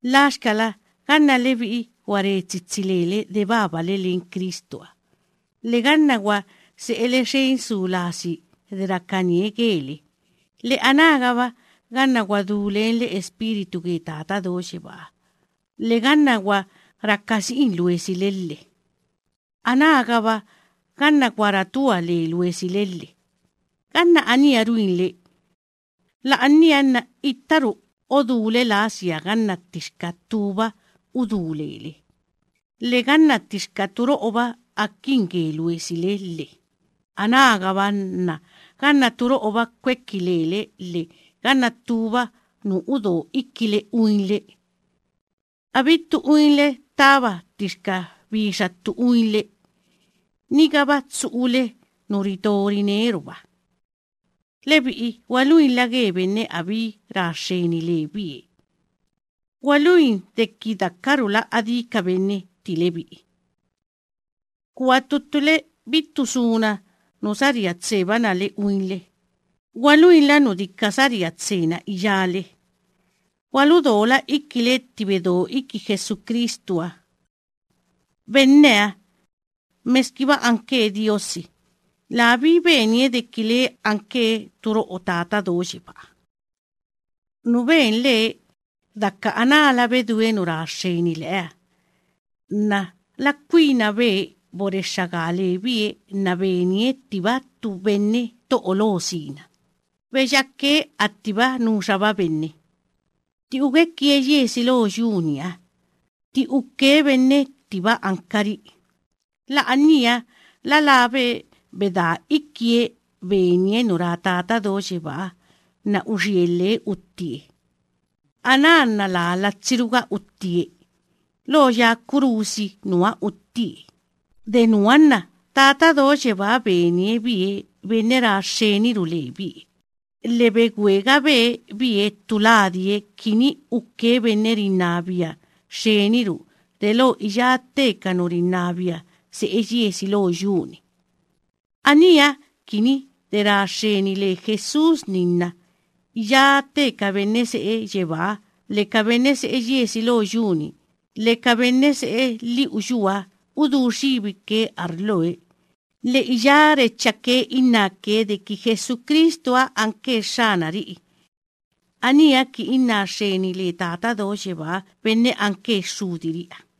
Laxkala ganna lebi'i gwa re tsitsi lele de babale len Cristuha, lhe ganna gwa se'ele xen su lasi de rakanie gele, lhe anágaba ganna gwa du lenle Espíritu ge Tata Do Yebáha, lhe ganna gwa raka si'in luesile, lhe anágaba ganna gwa ratua le luesile lhe, ganna aníha ruinle, la'ania nna ittaru odúle lasia ganna ttixka ttúba udú lele, lhe ganna ttixka turo'oba akin ge luesile lhe, anágaba nna ganna turo'oba kweki lele, lhe ganna ttúba nu udo ikile uinle. Abittu uinle ttaba ttixka bixa ttu uinle, nigaba tsu'ule nu rito rineruba. Lebi'i gwaluinla ge benne abí ra xxeni lebie; gwaluin deki dakarula adí ka benne tti lebi'i. Kua ttu ttule abittu suna nu saría tsebana le uinle; gwaluinla nu dika saría tsena iyále. Gwaludola ikile tti bedo iki Jesucristuha. Benneha, meskiba anke Diosi, labí benie deki lee anke turo'o len Tata Do Yebáha. Nu benlee: daka anála bedúe nu ra xxeni leeha nna la kwinabe borexxa gaa lebie nna benie ttiba ttu benne to'o lo sina; beyake attiba nuxaba benne. Tti ugwekie yiesi lo yu‑niha, tti uke benne attiba ankari'i, la'ania la labe bedaa ikie benie nu ra Tata Do Yebáha nna uxielhe uttie. Aná nna laa latsiruga uttie, lo ya kurusi nuha uttie. De nuha nna Tata Do Yebáha benie bie benne ra xxeniru lebie, lhe begwegabe bie ttu ladie kini uke benne rinnabia xxeniru delo iyá tte ka nu rinnabia se'e yiesi lo yu‑ni. Aníha kini de ra xxeni le Jesús‑ni nna iyá tte ka benne se'e yebáha lhe ka benne se'e yiesi lo yu‑ni lhe ka benne se'e lhi'u yuha, udú xibike arloe, lhe iyá rechake innáke deki Jesucristuha anke Xxanari'i. Aníha kini inná xxeni le Tata Do Yebaa benne anke Xxudiri'iha.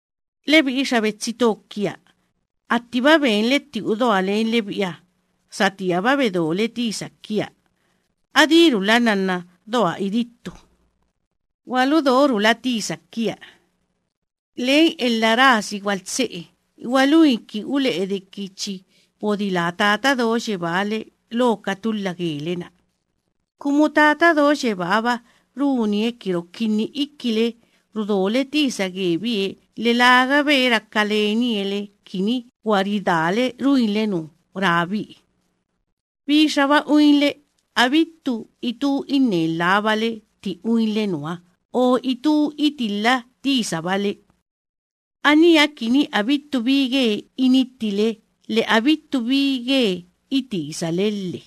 Lebi'i xa betsi to kia, attiba benle tti udoa len lebi'iha, satíaba bedole tisa kia, adírula nnanna doa idittu, gwaludorula tisa kia. Len elha rasi gwaltse'e gwaluin kini ule'e deki chi bodilaa Tata Do Yebáha le lo ka tulha gele‑na, kumu Tata Do Yebáha‑ba runie ki rokinni ikile rudole tisa gebie, lhe lagabe raka lenie le kini gwa ridaale ruinle nu rabie. Bixaba uinle, abittu itú inne lhábale tti uinle nuha o itú itilha tisabale. Aníha kini abittu bi ge inittile, lhe abittu bi ge itisale lhe,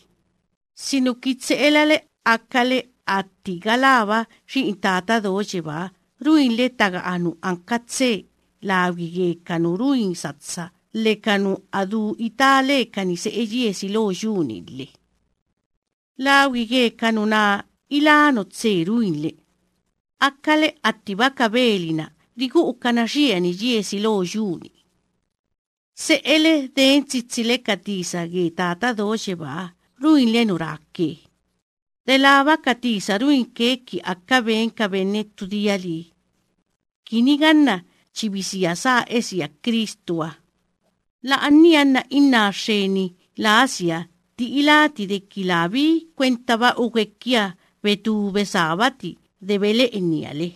sinuki tse'elale akale atti galába xi'in Tata Do Yebáha, ruinle taga'a nu anka tse lagwi ge ka nu ruin satsa lhe ka nu a du itá lekani se'e yiesi lo yu‑ni lhe. Lagwi ge ka nuná ilá nu tse ruinle, akale attiba ka beli‑na rigu'ukana xiani yiesi lo yu‑ni. Se'ele den tsitsile ka tisa ge Tata Do Yebáha ruinle nu ráke, delába ka tisa ruinke ki aka ben ka benne ttu dia lii, kini ganna chi bisia sá esia Cristuha, la'ania nna inná xxeni lasia tti iláti deki labí kwentaba ugwekia betú besábati de bele'enia le.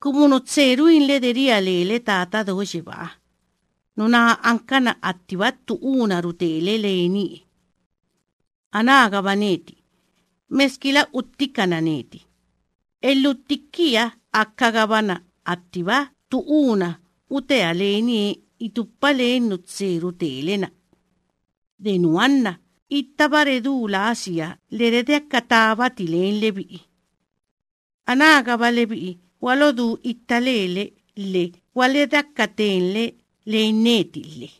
Kumu nu tse ruinle de ria lele Tata Do Yebáha, nuná ankana attiba ttu úna rutele lenie. Anágaba neti, meskila uttikana neti, elhutti kiaha akagabana attiba ttu úna utea lenie itupa len nu tse rutele‑na. De nuha nna ittaba redú lasia lhe redeaka tábati len lebi'i. Anágaba lebi'i gwalodú itta lele lhe gwaledeaka tenle len neti lhe.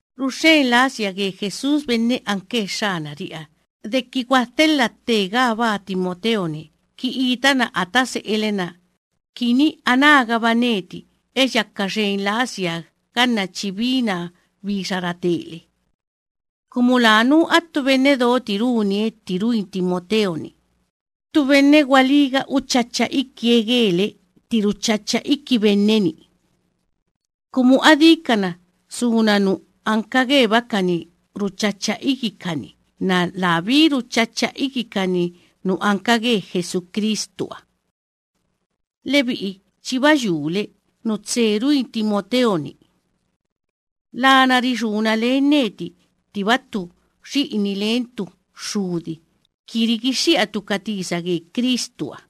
Ruxxen lasia ge Jesús benne anke Xxanari'iha deki gwadhelha tte gaabaa Timoteo‑ni kini itana ata se'ele‑na, ki anágaba neti eyaka xen lasia ganna chi binaa bixa ratele, kumu lanú attu benne doti runie tti ruin Timoteo‑ni, ttu benne gwalíga uchacha ikie gele tti ruchacha iki benne‑ni. Kumu adíkana suna nu anka gebakani ruchacha ikikani nna labí ruchacha ikikani nu anka ge Jesucristuha. Lebi'i chiba yule nu tse ruin Timoteo‑ni. Lana rixúna len neti ttiba ttu xi'ini len ttu xxudi kini rigixxi'atu ka tisa ge Cristuha.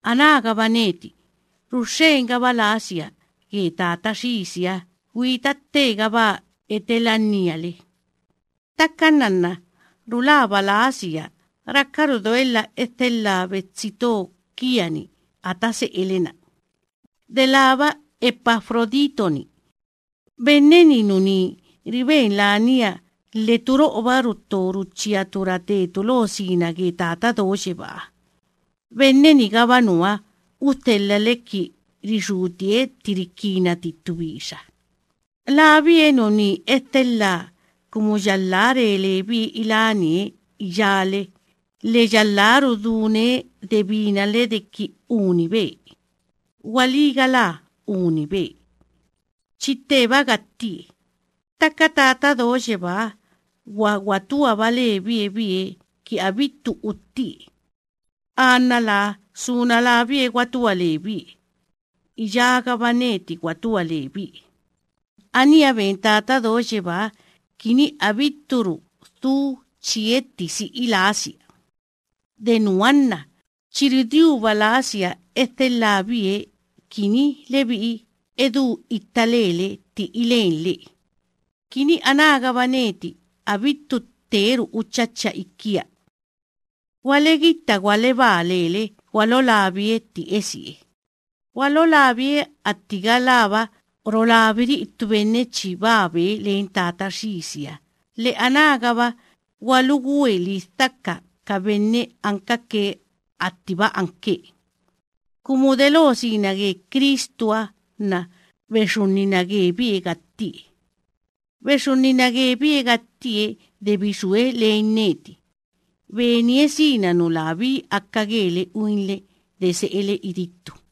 Anágaba neti, ruxxengaba lasia ge Tata Xisiha gwita tte gaabaa etelannia le. Ttaka nnanna rulaba lasia raka doelha edhelhaa betsi to kia‑ni ata se'ele‑na, delába Epafrodito‑ni. Benne‑ni nuní riben lania lhe turo'oba rutto ruchíatu ratetu lo sina ge Tata Do Yebáha. Benne‑nigaba nuha udhelhale kini rixútie tti rikinati ttu bixa. Labie nuní edhelhaa kumu yalhá re lebie ilánie iyále lhe yalhá rudúne de binale deki unibe. Gwalí galá unibe, chi tteba gattie. Ttaka Tata Do Yebáha gwa gwatuaba lebie bie kini abittu uttie. Anna laa suna labie gwatua lebie, iyágaba neti gwatua lebie. Aníha ben Tata Do Yebáha kini abitturu dhu chietti si'i lasia. De nuha nna chi rudiuba lasia edhelhaa bie kini lebi'i edú itta lele tti ilenlee, kini anágaba neti abittu tteru uchacha ikia. Gwalodú itta lele gwalolabie tti esie. Gwalolabie atti galába rolabiri'i ttu benne chi babe len Tata Xisiha, lhe anágaba gwalugwe lidhaka ka benne ankake attiba labie, kumu delo sina ge Cristuha nna bexunnina gebie gattie. Bexunnina gebie gattie de bixúe len neti, benie sina nu labí aka gele uinle de se'ele idittu.